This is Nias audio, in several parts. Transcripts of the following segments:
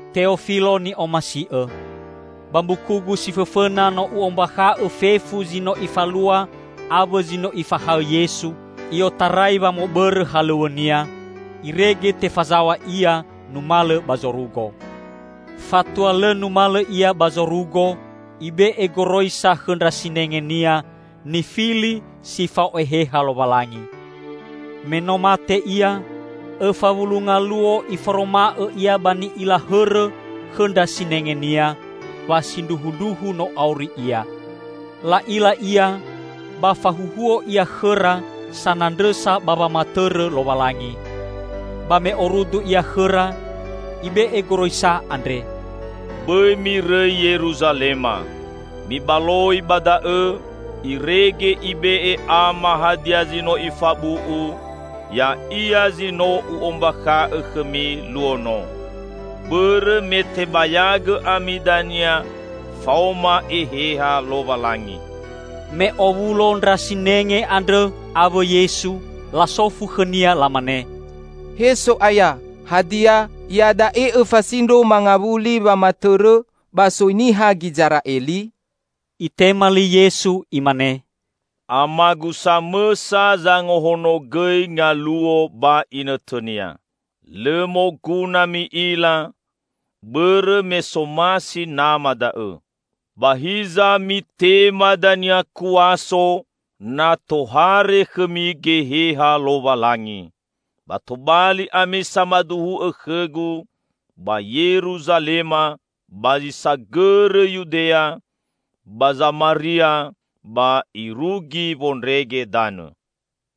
Teofilo ni'omasi'õ, Ba mbukugu si fõfõna no u'ombakha'õ fefu zi no Ifalua awõ zi no Ifahaõ Yesu i'otarai wamõbõrõ halõw̃õ-Nia, irege tefazaw̃a Ia numalõ ba zorugo. Fatua lõ numalõ Ia ba zorugo, Ibe'e goroisa khõ ndra sinenge-Nia nifili si fao Eheha Lowalangi. Me no mate Ia, õfa wulu ngaluo Iforoma'õ Ia ba ni'ila hõrõ khõ ndra sinenge-Nia wa sindruhundruhu no auri Ia. La'ila Ia, ba fahuhuo Ia khõra sanandrõsa ba wamatõrõ Lowalangi. Ba me orudu Ia khõra, Ibe'e goroisa andre, "Bõi mirõi Yeruzalema. Mibaloi ba da'õ irege Ibe'e Ama hadia zi no Ifabu'u, ya'ia zi no U'ombakha'õ khõmi luo no. Bõrõ me tebayagõ ami dania faoma Eheha Lowalangi." Me owulo ndra sinenge andrõ awõ Yesu, lasofu khõ-Nia lamane, "He So'aya, hadia iada'e Õfasindro mangawuli wamatõrõ ba soi niha Gizera'eli?" Itema li Yesu, Imane, "Amagu samõsa zangahonogõi ngaluo ba inõtõnia. Lõ moguna mi'ila, bõrõ me somasi Nama da'õ. Ba hiza mitema dania kuaso, na tohare khõmi Geheha Lowalangi. Ba tobali ami samaduhu'õ khõ-Gu ba Yeruzalema, ba zi sagõrõ Yudea, ba Zamaria, ba irugi wondrege danõ."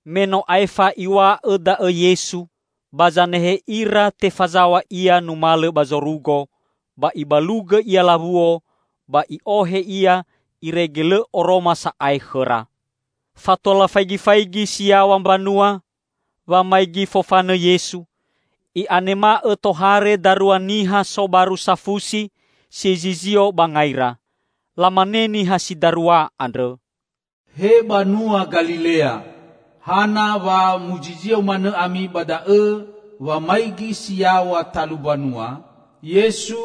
Me no aefa Iw̃a'õ da'õ Yesu, ba zanehe ira tefazaw̃a Ia numalõ ba zorugo, ba ibalugõ Ia lawuo, ba i'ohe Ia irege lõ oroma sa'ae khõra. Fatua lafaigifaigi si yaw̃a mbanua, wamaigi fofanõ Yesu, i'anema'õ tohare darua niha sobaru safusi si zizio ba ngaira. Lamane niha si darua andrõ, "He banua Galilea, hana wa muzizio manõ ami ba da'õ wamaigi si yaw̃a talu mbanua? Yesu,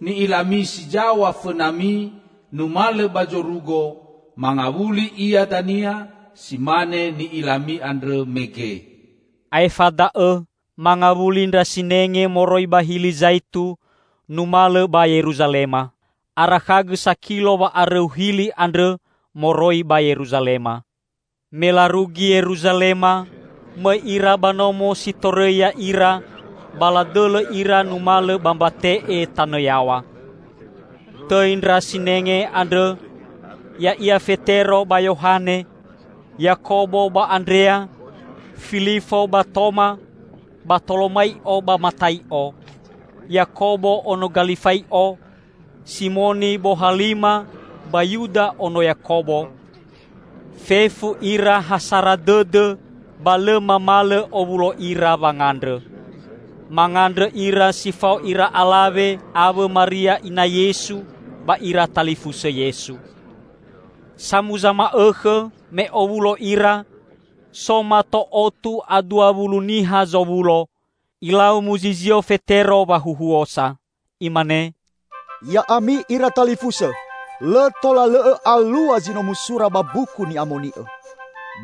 ni'ilami si zaw̃a fõnami numalõ ba zorugo, mangawuli Ia dania si mane ni'ilami andrõ mege." Aefa da'õ mangawuli ndra sinenge moroi ba Hili Zaitu numalõ ba Yeruzalema. Arakhagõ sakilo wa'arõu Hili andrõ moroi ba Yeruzalema. Me larugi Yeruzalema, mõi ira ba nomo si torõi ya'ira, ba ladõlõ ira numalõ ba mbate'e tanõ yaw̃a. Tõi ndra sinenge andrõ, ya'ia Fetero ba Yohane, Yakobo ba Andrea, Filifo ba Toma, Batolomai'o ba Matai'o, Yakobo ono Galifai'o, Simoni bohalima ba Yuda ono Yakobo; fefu ira ha sara dõdõ ba lõ mamalõ owulo ira wangandrõ. Mangandrõ ira si fao ira alawe awõ Maria ina Yesu ba ira talifusõ Yesu. Samuza ma'õkhõ, me owulo ira -- so mato otu a dua wulu niha zowulo -- ilau muzizio Fetero wahuhuosa. Imane, "Ya'ami ira talifusõ! Lõ tola lõ'õ alua zi no musura ba Mbuku Ni'amoni'õ.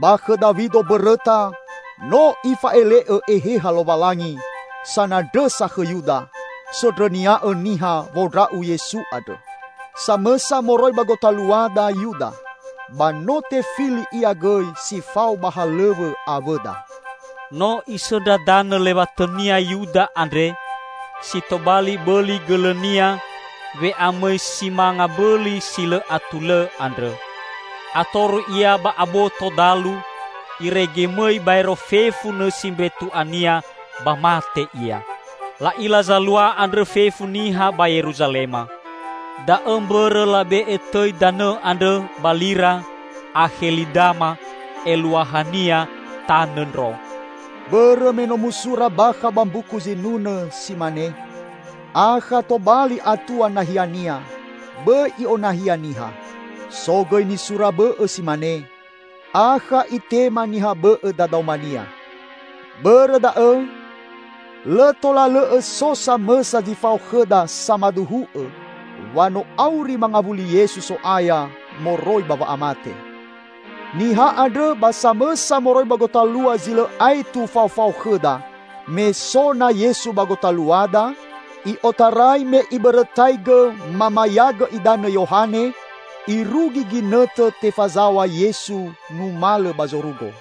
Ba khõ Dawido mbõrõta, no Ifa'ele'õ Eheha Lowalangi sanandrõsa khõ Yuda, sondrõnia'õ niha wondra'u Yesu andrõ. Samõsa moroi ba gotaluada Yuda, ba no tefili ia gõi si fao ba halõw̃õ awõda." (No isõndra danõ lewatõnia Yuda andre si tobali bõli gõlõnia we'amõi si manga mbõli si lõ atulõ andrõ. Atoru ia ba aboto dalu, irege mõi baero fefu nõsi mbetu'ania ba mate ia. La'ila zalua andrõ fefu niha ba Yeruzalema. Da'õ mbõrõ labe'e tõi danõ andrõ ba lira Akhelidama, eluahania 'Tanõ Ndro'.) "Bõrõ me no musura bakha ba Mbuku Zinunõ, si mane, 'Akha tobali atua nahiania; bõi i'onahia niha.' So gõi nisura bõ'õ si mane, 'Akha itema niha bõ'õ dadaomania.' Bõrõ da'õ, lõ tola lõ'õ so samõsa zi fao khõda samaduhu'õ wa no auri mangawuli Yesu So'aya moroi ba wa'amate. Niha andrõ ba samõsa moroi ba gotalua zi lõ aetu faofao khõda me so na Yesu ba gotaluada, i'otarai me ibõrõtaigõ mamayagõ idanõ Yohane irugi ginõtõ tefazaw̃a Yesu numalõ ba zorugo."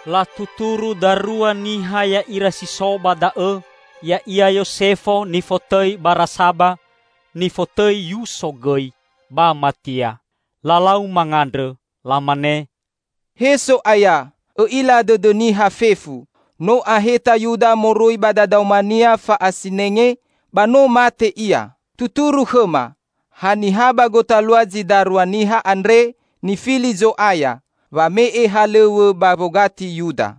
Latuturu darua niha ya'ira si so ba da'õ, ya'ia Yosefo nifotõi Barasaba (nifotõi Yuso gõi), ba Matia. Lalau mangandrõ. Lamane, "He So'aya, Õ'ila dõdõ niha fefu. No aheta Yuda moroi ba dadaomania fa'asinenge ba no mate ia. Tuturu khõma, haniha ba gotalua zi darua niha andre nifili Zo'aya wame'e halõw̃õ ba wogati Yuda."